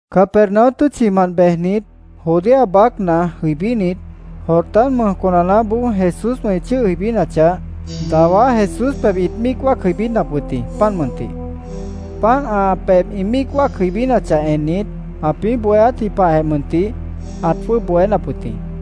Capernaum tʉ́tchimant bejnit, Judea baácna jʉibínit, Jordán mʉj conanaáboó Jesúswã ĩ chʉ́ʉh jʉibínachah, dawá Jesús pebh ĩt míic wáac jʉibínap wʉt jĩ, páant mʉntih. Páant ã pebh ĩ míic wáac jʉibínachah ennit, ãpĩ́ bohéátji pahjeh mʉntih ãt jwʉ́ʉb bohénap wʉt jĩ.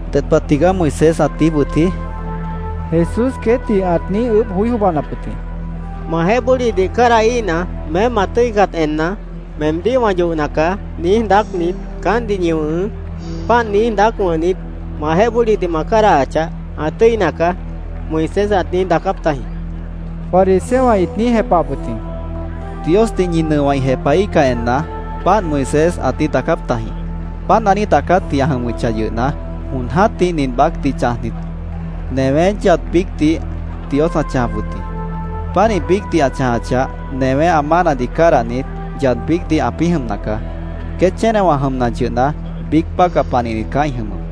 —¿Ded pah tigaá Moisés ãt niíj wʉtji? Jesús queétdih ãt niíj ʉʉ́bh joí jwʉ́ʉbanap wʉt jĩ. —‘Majeéh bólidih cádahíhna, “Meém ma tʉ́icat enna, meemdíh wã yohna caá”, niíj daácnit, caántdih ñi wʉ̃hʉʉ́. Páant niíj daác wʉ̃hnit, majeéh bólidih ma cádahachah, ã tʉ́ina caá’, Moisés ãt niíj daacáp tajĩ, fariseowã ĩt niíj jepahap wʉt jĩ. —Diosdih ñi nʉowã ĩ jepahíhcah enna, páant Moisés ãt niíj daacáp tajĩ. Páant ã niíj daacátji ã jʉmʉchah yʉhna, jon jã́tih nin baácdih chãjnit, newé yad biícdih Dios ãt chãjap wʉt jĩ. Pánih biícdih ã chãjachah, newé ã mánadih cádahnit, yad biícdih ãpĩ́ jʉmna caá. Queét chénewã jʉmna yʉhna, biíc bácah panihnit caá ĩ jʉmʉp.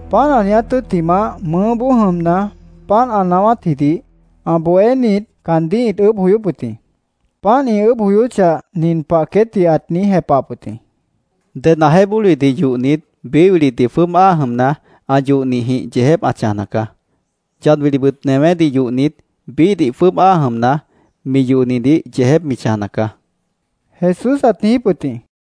Páant ã niiját tʉ́ttimah, mʉʉ́boó jʉmna, páant ã naáwátjidih ã bohénit caandíh ĩt ʉʉ́bh joyóp wʉt jĩ. Páant ĩ ʉʉ́bh joyóchah, nin pah queétdih ãt niíj jepahap wʉt jĩ: —Ded ãjeéh bólidih yohnit, biíh wilidih jwʉ́ʉb áa jʉmna, ã yohnihdih yeejép ã chãjna caá. Yad wilibʉt newédih yohnit, biíhdih jwʉ́ʉb áa jʉmna, mi yohnidih yeejép mi chãjna caá, Jesús ãt niijíp wʉt jĩ.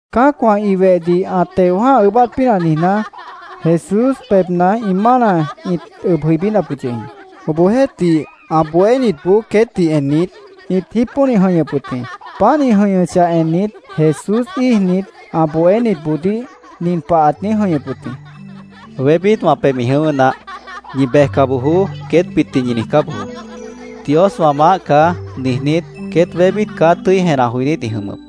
Cã́acwã ĩ wehdih ã teo jã́ha ʉʉ́bát pínah niijná, Jesús pebhna ĩ mána ĩt ʉb jʉibínap wʉt yʉh jĩ. Obohjeéhtih, ã bohénitboó queétdih ennit, ĩt jípónih jʉ̃ihñʉp wʉt jĩ. Páant ĩ jʉ̃ihñʉchah ennit, Jesús íijnit, ã bohénitboodíh nin pah ãt niíj jʉ̃ihñʉp wʉt jĩ: —Wébít wã pebh ĩ jʉ̃ʉ́wʉ́ naáh. ‘Ñi bejca bojoó’, queétbitdih ñi niijcá bojoó. ‘Dios wã maáh caá’, niijnít, queét wébít caá tʉ́i jenah joinít ĩ jʉmʉp.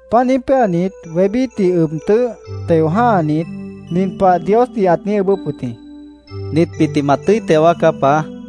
Páant niíj péanit, wébítdih ʉb tʉ́ʉh teo jã́hanit, nin pah Diosdih ãt niíj ʉʉ́bʉ́p wʉt jĩ: “Nitbitdih ma tʉ́i teo wáacá, Paá”, ãt niijíp wʉt jĩ.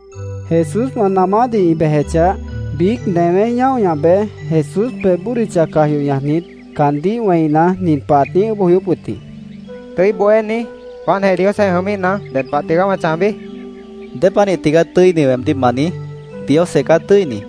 Jesúswã namádih ĩ bejechah, biíc newé ñáo ñah bej, Jesús pebh bódicha caj yoh ñajnit, caandíh wẽina, nin pah ãt niíj ʉʉ́bh joyóp wʉt jĩ: —¿Tʉ́i Bohéní, páantjeh Diosjeéh jʉmíhna, ded pah tigaá wã chãjbi? ãt niijíp wʉt jĩ. —¿Dépanih tigaá ‘Tʉ́ini’, weemdíh ma niíj? Diosjeh caá tʉ́ini.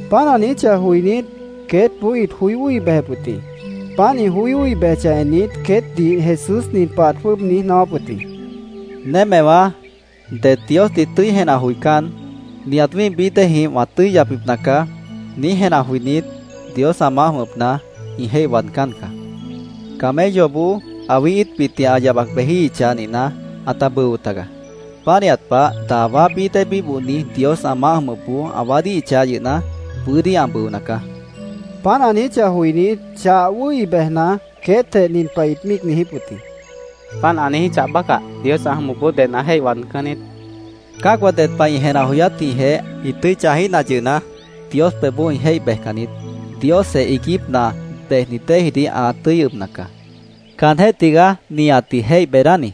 Páant ã niijíchah joinít, queétboó ĩt joí wʉ́hi bejep wʉt jĩ. Páant ĩ wʉ́hi bejechah ennit, queétdih Jesús nin pah ãt jwʉ́ʉb niíj naáwáp wʉt jĩ: —Némewãá, det Diosdih tʉ́i jenah joicán, ‘Nihat wĩ́ih bií déejĩh wã tʉ́i yapbipna caá’, niíj jenah joinít, Dios ã maáh jʉmʉpna ĩ jéih waadcán caá. Camelloboó awí íitbitdih ã yabac bejíhichah nihna, ãta bʉo tagaá. Pánihat pah, dawá bií dée bíbohni Dios ã maáh jʉmʉpboó ã waádíhichah yʉhna, bʉ́dí ã bʉona caá, ãt niijíp wʉt jĩ. Páant ã niijíchah joinít, chah wʉ́hi bejna, queétjeh nin pah ĩt míic niijíp wʉt jĩ: —Páant ã niijíchah bácah, Dios ã jʉmʉpboó ded ã jéih waadcán niít, ĩt niijíp wʉt jĩ. —Cã́acwã ded pah ĩ jenah joyátjĩhjeh ĩ tʉ́i chãjíhna yʉhna, Dios pebhboó ĩ jéih bejcan niít. Diosjeh iiguípna bejnit déedih ã tʉ́i ʉbna caá. Caanjéh tigaá nihatdih jéih beedáni.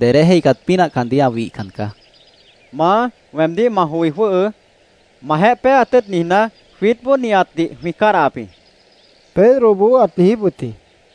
Dedé jéihcat pínah caandíh ã wihcan caá, Jesús queétdih ãt niijíp wʉt jĩ. —Maá, weemdíh ma joi jwʉ́hʉʉ́. Majeéh péeat tʉ́ʉt niijná, jwiítboó nihatdih jwĩ cádahap jĩ, Pedroboó ãt niijíp wʉt jĩ.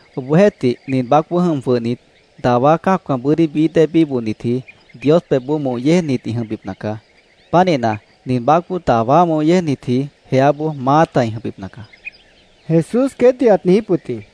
Obohjeéhtih, nin baácboó jʉm jwʉhnit, dawá cã́acwã bʉ́dí bií dée bíbohnitji, Dios pebhboó moh yéejnit ĩ jʉmbipna caá. Pánihna, nin baácboó dawá moh yéejnitji jeáboó maáta ĩ jʉmbipna caá, Jesús queétdih ãt niijíp wʉt jĩ.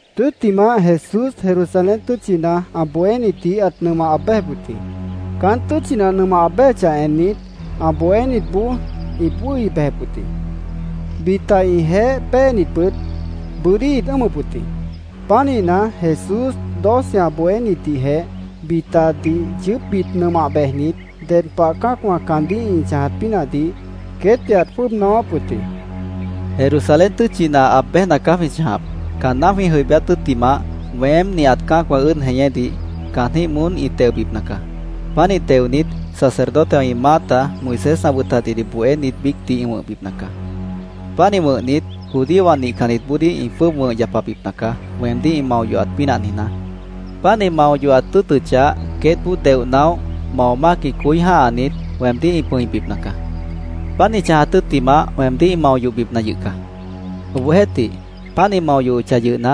Tʉ́ttimah, Jesús Jerusalén tʉ́tchina ã bohénitdih ãt nʉmah aab béjep wʉt jĩ. Caán tʉ́tchina ã nʉmah bejechah ennit, ã bohénitboó ĩt wʉ́hi bejep wʉt jĩ. Bita ĩjeéh péenitbʉt bʉ́dí ĩt ʉ́ʉmʉp wʉt jĩ. Pánihna, Jesús doce ã bohénitdihjeh bitadih yʉʉ́pbit nʉmah bejnit, ded pah cã́acwã caandíh ĩ chãjat pínahdih queétdih ãt jwʉ́ʉb naáwáp wʉt jĩ: “Jerusalén tʉ́tchina aab béjna caá jwĩ chãjap. Caanná jwĩ jʉibíát tʉ́ttimah, weém, nihat cã́acwã ʉ́ʉd jeñédih caanjĩ́h moón ĩ teobipna caá. Pánih teonit, sacerdotewã ĩ maáta, Moisés ã wʉtatjidih bohénit biícdih ĩ wʉ̃hbipna caá. Pánih wʉ̃hnit, judíowã nihcannitboodíh ĩ jwʉ́ʉb wʉ̃h yapabipna caá, weemdíh ĩ mao yohat pínah niijná. Páant ĩ mao yohat tʉ́ʉtʉchah, queétboó deoh naóh, mao mácjĩh coí jã́hanit, weemdíh ĩ pʉ̃ibipna caá. Páant ĩ chãjat tʉ́ttimah, weemdíh ĩ mao yohbipna yʉh caá. Obohjeéhtih, páant ĩ mao yohochah yʉhna,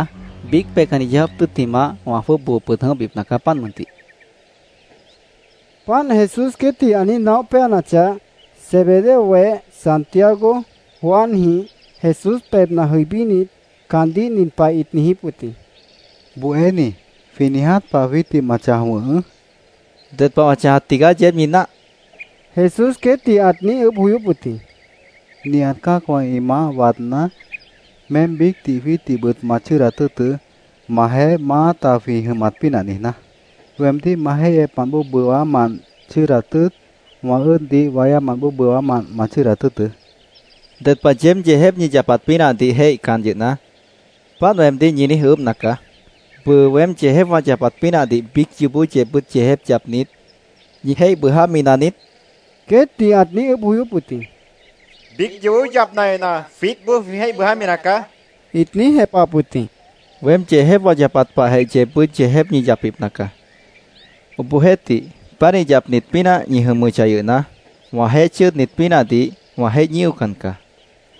biíc peihcanni yeó jáap tʉ́ttimah, wã jwʉ́ʉb boo pʉd jʉ̃óhbipna caá, páant mʉntih”, ãt niijíp wʉt jĩ. Páant Jesús queétdih ã niíj naóh péanachah, Zebedeo weh Santiago, Juanjĩh Jesús pebhna jʉibínit, caandíh nin pah ĩt niijíp wʉt jĩ: —Bohéní, jwĩ niiját pah jwiítdih ma chãj wʉ̃hʉʉ́, ĩt niijíp wʉt jĩ. —¿Ded pah wã chãjat tigaá yeéb ñi náah? Jesús queétdih ãt niíj ʉʉ́bh joyóp wʉt jĩ. —Nihat cã́acwã ĩ maáh waadná, meém biícdih jwiítdihbʉt ma chʉ́ʉdat tʉ́ʉtʉ́, majeéh maáta jwĩ jʉmat pínah niijná. Weemdíh ma jéihyepmant bóo bʉwámant chʉ́ʉdat tʉ́ʉt, wã ʉ́ʉdboodíh wáyámant bóo bʉwámant ma chʉ́ʉdat tʉ́ʉtʉ́, Jesúsdih ãt niijíp wʉt jĩ. —Ded pah yeéb yeejép ñi yapat pínahdih jéihcan yʉhna, páant weemdíh ñi niíj ʉʉ́bhna caá. ¿Bʉʉ weém yeejép wã yapat pínahdih biíc yoobó yeebbʉ́t yeejép yapnit, ñi jéih bʉʉjámi naniít? queétdih ãt niíj ʉʉ́bh joyóp wʉt jĩ. —Biíc yoobó yapna yʉhna, jwiítboó jwĩ jéih bʉʉjámi nacaá, ĩt niíj jepahap wʉt jĩ. —Weém yeejép wã yapat pahjeh yeebbʉ́t yeejép ñi yapbipna caá. Obohjeéhtih, pánih yapnit pínah ñi jʉmʉchah yʉhna, wãjeéh chʉ́ʉdnit pínahdih wã jéih ñíocan caá.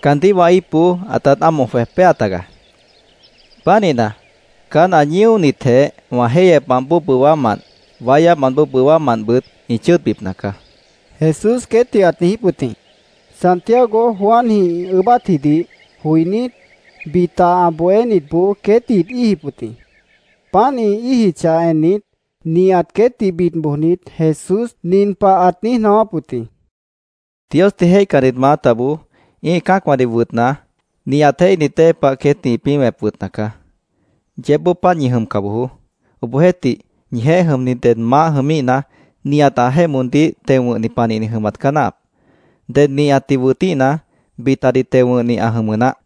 Caandíh wã íipboó ãtát ámoh jwej péa tagaá. Pánihna, caán ã ñíonitjeh wã jéihyepmant bóo bʉwámant, wáyámant bóo bʉwámantbʉt ĩ chʉ́ʉdbipna caá, Jesús queétdih ãt niijíp wʉt jĩ. Santiago Juanjĩh ĩ ʉʉ́bátjidih joinít, bita ã bohénitboó queétdih ĩt íijip wʉt jĩ. Páant ĩ íijichah ennit, nihat queétdih bid bojnit, Jesús nin pah ãt niíj naáwáp wʉt jĩ: —Diosdih jéihcannit maátaboó ĩ́ih cã́acwãdih wʉtna, nihat jéihnit dée pah queétdih ĩpĩ́ wẽp wʉtna caá. Yeébboó páant ñi jʉmca bojoó. Obohjeéhtih, ñijeéh jʉmni ded maáh jʉmíhna, nihat ãjeéh moondíh teo wʉ̃hni panihni jʉmat caá náahap. Ded nihatdih wʉtíhna, bitadih teo wʉ̃hni ã jʉmʉ naáh.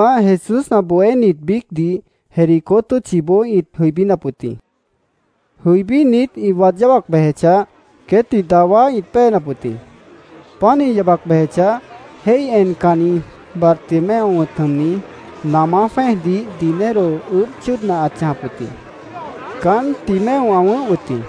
Tʉ́ttimah, Jesús ã bohénit biícdih Jericó tʉ́tchiboó ĩt jʉibínap wʉt jĩ. Jʉibínit, ĩ waad yábac bejechah, queétdih dawá ĩt péenap wʉt jĩ. Páant ĩ yabac bejechah, jéih encanni, Bartimeo wʉ̃t jʉmni, namá jwẽ́ejdih dinero ʉʉ́bh chʉ́ʉdna ãt chãjap wʉt jĩ. Caán Timeo ã wʉ̃ʉ́h wʉt jĩ.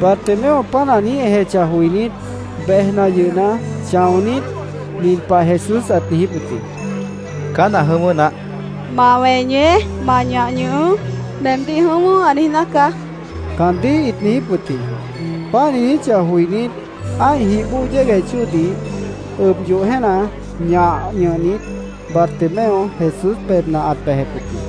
Bartimeo páant ã niíj ejechah joinít, bejna yʉhna, chãonít, nin pah Jesús ãt niijíp wʉt jĩ: —Caán ã jʉ̃ʉ́wʉ́ naáh, ãt niijíp wʉt jĩ. —Ma weñeé. Ma ñah ñʉhʉʉ́. Meemdíh ‘Jʉ̃ʉ́wʉ́’, ã niijná caá, caandíh ĩt niijíp wʉt jĩ. Páant ĩ niijíchah joinít, ã́ih jih bóo yégueh chóodih ʉb yoh jéena, ñah ñʉhnit, Bartimeo Jesús pebhna ãt bejep wʉt jĩ.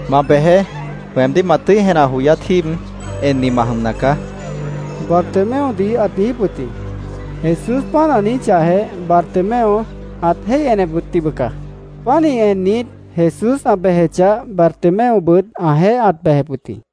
—Ma bejeé. Weemdíh ma tʉ́i jenah joyát jíib enni ma jʉmna caá, Bartimeodih ãt niijíp wʉt jĩ. Jesús páant ã niijíchahjeh, Bartimeo ãt jéih enep wʉt jĩ, bʉca. Pánih ennit, Jesús ã bejechah, Bartimeobʉt ãjeéh ãt bejep wʉt jĩ.